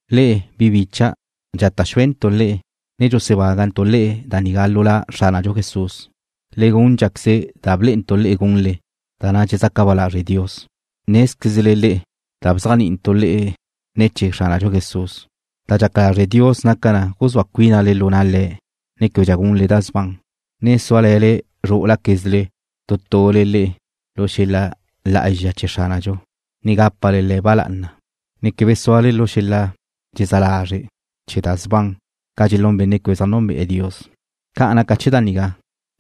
Le'e, bi bicha', dxata' xúentu' le'e, ne dxusebágantu' le'e da nigá lu La Xránadxu Jesús. Le gúndxaqueze da blé'entu' le'e gunle, da na' dxezaca ba lazre' Dios. Nézquezle le'e da bzéajni'intu' le'e ne̱ chee̱ Xránadxu Jesús. Da dxaca lazre' Dios naca na guzúa cuínale lu na' Le̱', ne québedxa gunle da sban, na' súale̱le zrú'ulaquezle tu tule le'e lu xel-la lá'azxa chee̱ Xránadxu, ne gápale le̱' ba lá'ana, ne quebe súale lu xel-la dxezá lazre' chee̱ da sban ca dxelún benne' quebe zaj nunbe'e̱ Dios. Ca naca chee̱ da nigá,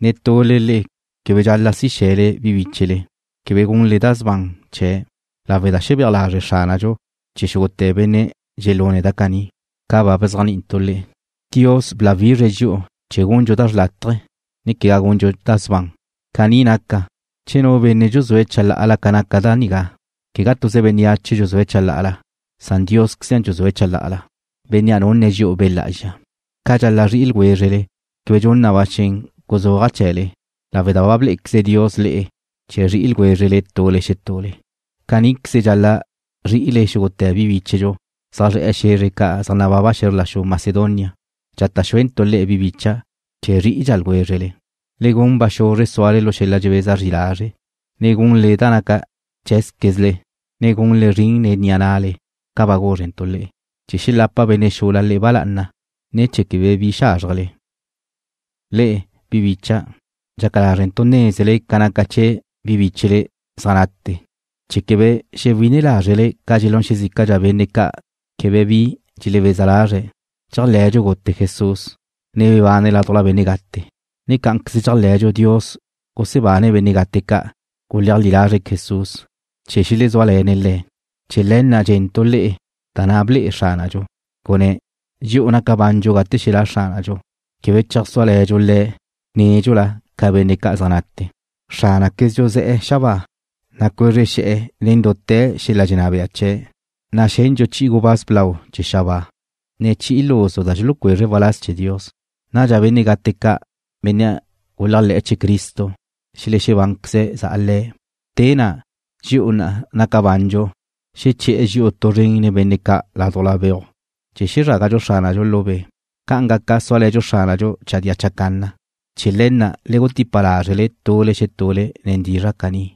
netule le'e quebe dxal-la' si xe̱le bi bíchele, quebe gunle da sban chee̱', lawe' da xebéaj lazre' Xránadxu chee̱ xúgute̱ benne' dxelune̱' da caní, ca ba bzéajni'intu' le'e. Dios bláwizre̱' dxi'u chee̱ gundxu da xrlátaje, ne quegá gundxu da sban. Caní naca, che nu benne' dxuzúe̱' chalá'ala ca naca da nigá, quegá tuze bénneache dxuzúe̱' chalá'ala, san Diósqueze dxuzúe̱' chalá'ala, Bénnea' nunne̱' dxi'u Be' Lá'azxa. Ca dxal-la' zri'i ljwézrele quebe dxun na ba xen guzúaja' chee̱le, lawe' da ba blé'equeze Dios le'e chee̱ zri'i ljwézrele tule xetule. Caníqueze dxal-la' zri'ile xúgute̱ bi bíchedxu zaj zre̱'e̱ xe̱zre ca' zaj nababa xe̱zr la xu Macedonia. Dxata' xuentu' le'e, bi bicha', chee̱ zrí'idxa ljwézrele. Le gun ba xuzre súale lu xel-la dxebeza zri lazre', ne gunle da naca cheé̱zquezle, ne gunle zrin nen ni'a na'le ca ba guzrentu' le'e, chee̱ xelapa benne' xula le'e ba lá'ana, ne chee̱ quebe bi xázrjele le'e. Le'e, bi bicha', dxaca lázrentu' nézele ca naca chee̱ bi bíchele zaj nate, chee̱ quebe xewine lázrele ca dxelún xezícadxa benne' ca' quebe bi dxelebeza lazre̱'. Dxéajle̱dxu gute Jesús, ne bebane̱' ládujla benne' gate, ne cá'anqueze dxéajle̱dxu Dios gusebane̱' benne' gate ca' guleajlí lazre̱' Jesús, chee̱ xelezúale̱ne̱' Le̱'. Chee̱ le̱ na' dxe̱ntu' le'e da na' ble'e Xránadxu, gunné̱': Dxi'u naca bandxu gate xelá' Xránadxu, quebe cheajsúale̱dxu Le̱' nédxula ca benne' ca' zaj nate. Xránaquezdxu ze̱'e̱ xabáa, na' cuezre xe̱'e̱ nen dute̱ xel-la dxenná bea chee̱', na' xendxu chi'i gubáz blau chee̱ xabáa, ne chi'i luzu da dxulucuezre̱' waláz chee̱ Dios. Nadxa benne' gate ca', benne' guléajle̱'e̱ chee̱ Cristo xelexebánqueze̱' za'a le̱'. Te na', dxi'u na' naca bandxu xeché̱'e̱ dxi'u tu zren nen benne' ca' ládujla beuj chee̱ xezrágadxu Xránadxu lu be'. Ca'an gaca súale̱dxu Xránadxu chadía chacanna. Chee̱ le̱ na' le gutipa lázrele tule xetule nen dizra' caní.